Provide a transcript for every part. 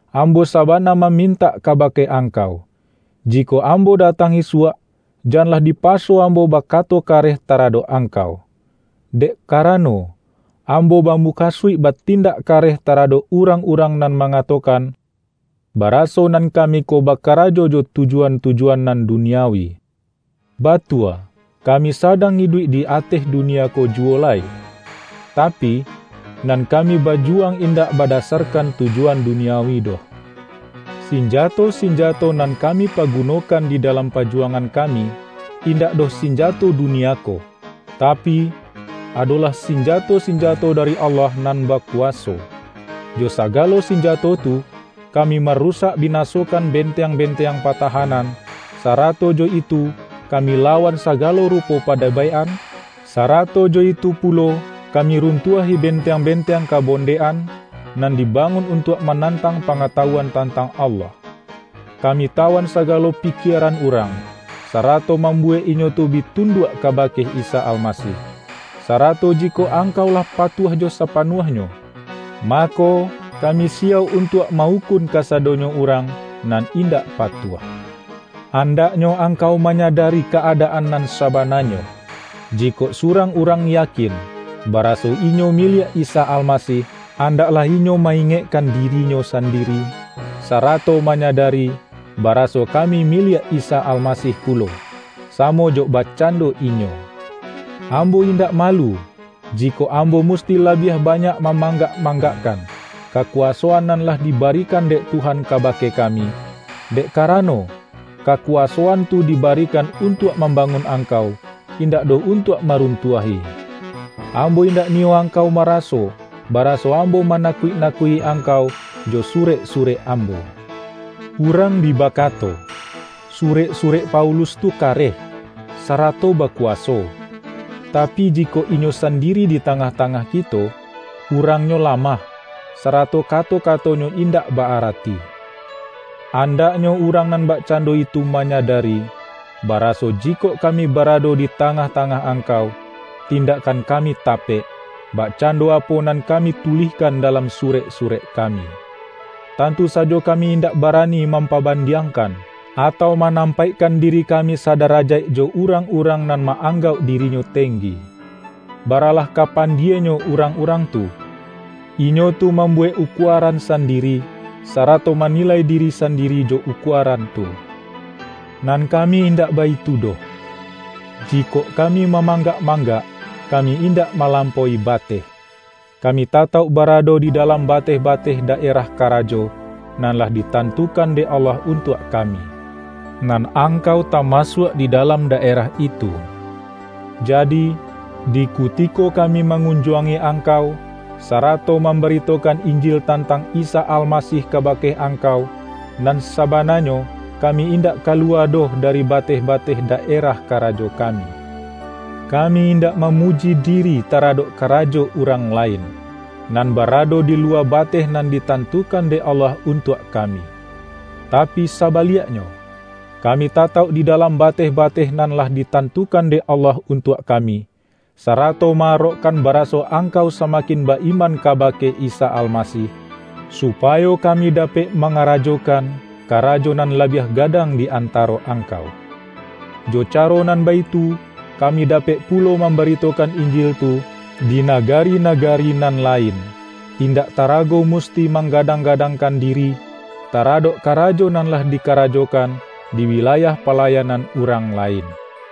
ambo sabana mamin-tak kabake angkau, jikok ambo da-tang isuak, janlah dipaso ambo baka-to kareh taradok angkau. Dek karano, ambo bamukasuik batindak kareh ta-radok urang-urang nan mangatokan, baraso nan kami ko bakarajo jo tuju-an-tujuan nan duniawi. Batua kami sadang iduik di ateh dunia ko juwo lai, tapi, nan kami bajuwang indak bada-sarkan tujuan duniawi doh. Sinjato-sinjato nan kami pagunokan di dalam pajuwangan kami, indak doh sinjato dunia ko, tapi, adolah sinjato-sinjato dari Allah nan bakuwaso. Jo sagalo sinjato tu, kami marusak binasokan benteang-benteang patahanan; sara-to jo itu kami lawan sagalo rupo pa-debaik-an, sarato jo itu pulo kami runtuahi benteang-benteang kabon-dek-an, nan dibangun untuak manan-tang pangatawuan tantang Allah. Ka-mi tawan sagalo pikieran urang, sarato mambuwek inyo tu bi tunduak kaba-ke Isa Almasih. Sarato jikok angkau lah patuah jo sapanuahnyo, mako, ka-mi siyauk untuak ma-ukun kasadonyo urang nan indak patuah. Andaknyo angkau manyadari ka-adaan nan sabananyo. Jikok surang urang yakin, baraso inyo miliak Isa Al-masih, andaklah inyo ma-ingekkan di-rinyo sandiri, sarato manyadari, bara-so kami miliak Isa Almasih pulo, samo jo bakcando inyo. Ambo indak malu, jikok ambo musti labiah banyak ma-manggak-manggakkan, kakuwasoan nan lah dibarikan dek Tuhan kabake kami, dek karano, kakuwasoan tu di-barikan untuak mambangun angkau, indak doh untuak maruntuah-i. Am-bo indak niyo angkau maraso baraso ambo manakuik-nakuik-i angkau jo surek-surek ambo. Urang bi bakato,”Surek-surek Paulus tu kareh, sarato bakuwaso, tapi, jikok inyo sandiri di tangah-tangah kito, urangnyo lamah, sarato kato-katonyo indak ba-arati!” Andaknyo urang nan bakcando itu manyadari, baraso jikok kami barado di tangah-tangah angkau, tindakkan kami tapek, bakcando apo nan kami tulihkan dalam surek-surek kami. Tantu sajo kami indak barani mampabandiangkan, atau manam-paikkan diri kami sadarajaik jo urang-urang nan ma-anggauk dirinyo tenggi. Baralah ka pandienyo urang-urang tu! Inyo tu mambuwek ukuaran sandiri, sarato manilai diri sandiri jo ukuaran tu. Nan kami indak baitu doh. Ji-kok kami mamanggak-manggak, kami indak malampaui bateh. Kami tatauk barado di dalam bateh-bateh daerah karajo, nan lah ditantukan dek Allah untuak kami. Nan angkau tamasuak di dalam daerah itu. Jadi, di kuti-ko kami mangunjuangi angkau, sa-rato mambaritokan Injil tantang Isa Almasih kabake angkau, nan sabana-nyo kami indak kaluwa doh dari ba-teh-bateh daerah karajo kami. Ka-mi indak mamuji diri taradok karajo urang lain, nan barado di luwa bateh nan ditantukan dek Allah untuak ka-mi. Tapi sabaliaknyo, kami tatauk di dalam bateh-bateh nan lah ditantu-kan dek Allah untuak kami, sarato ma-arokkan baraso angkau samakin ba-iman kabake Isa Almasih, supa-yo kami dapek mangarajokan karajo nan labiah gadang di antaro angkau. Jo caro nan baitu, kami dapek pulo mambaritokan Injil tu di nagari-nagari nan lain, indak tarago musti mangga-dang-gadangkan diri, taradok karajo nan lah dikarajokan di wilayah pala-yanan urang lain.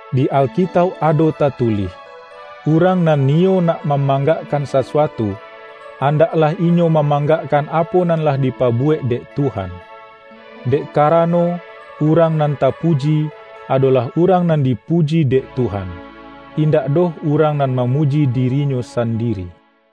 Di Alkitauk ado tatulih,”Urang nan niyo nak mamanggakkan sasu-atu, andaklah inyo mamanggakkan apo nan lah dipabuwek dek Tuhan.” Dek karano, urang nan tapuji, ado-lah urang nan dipuji dek Tuhan, in-dak doh urang nan mamuji dirinyo sandiri.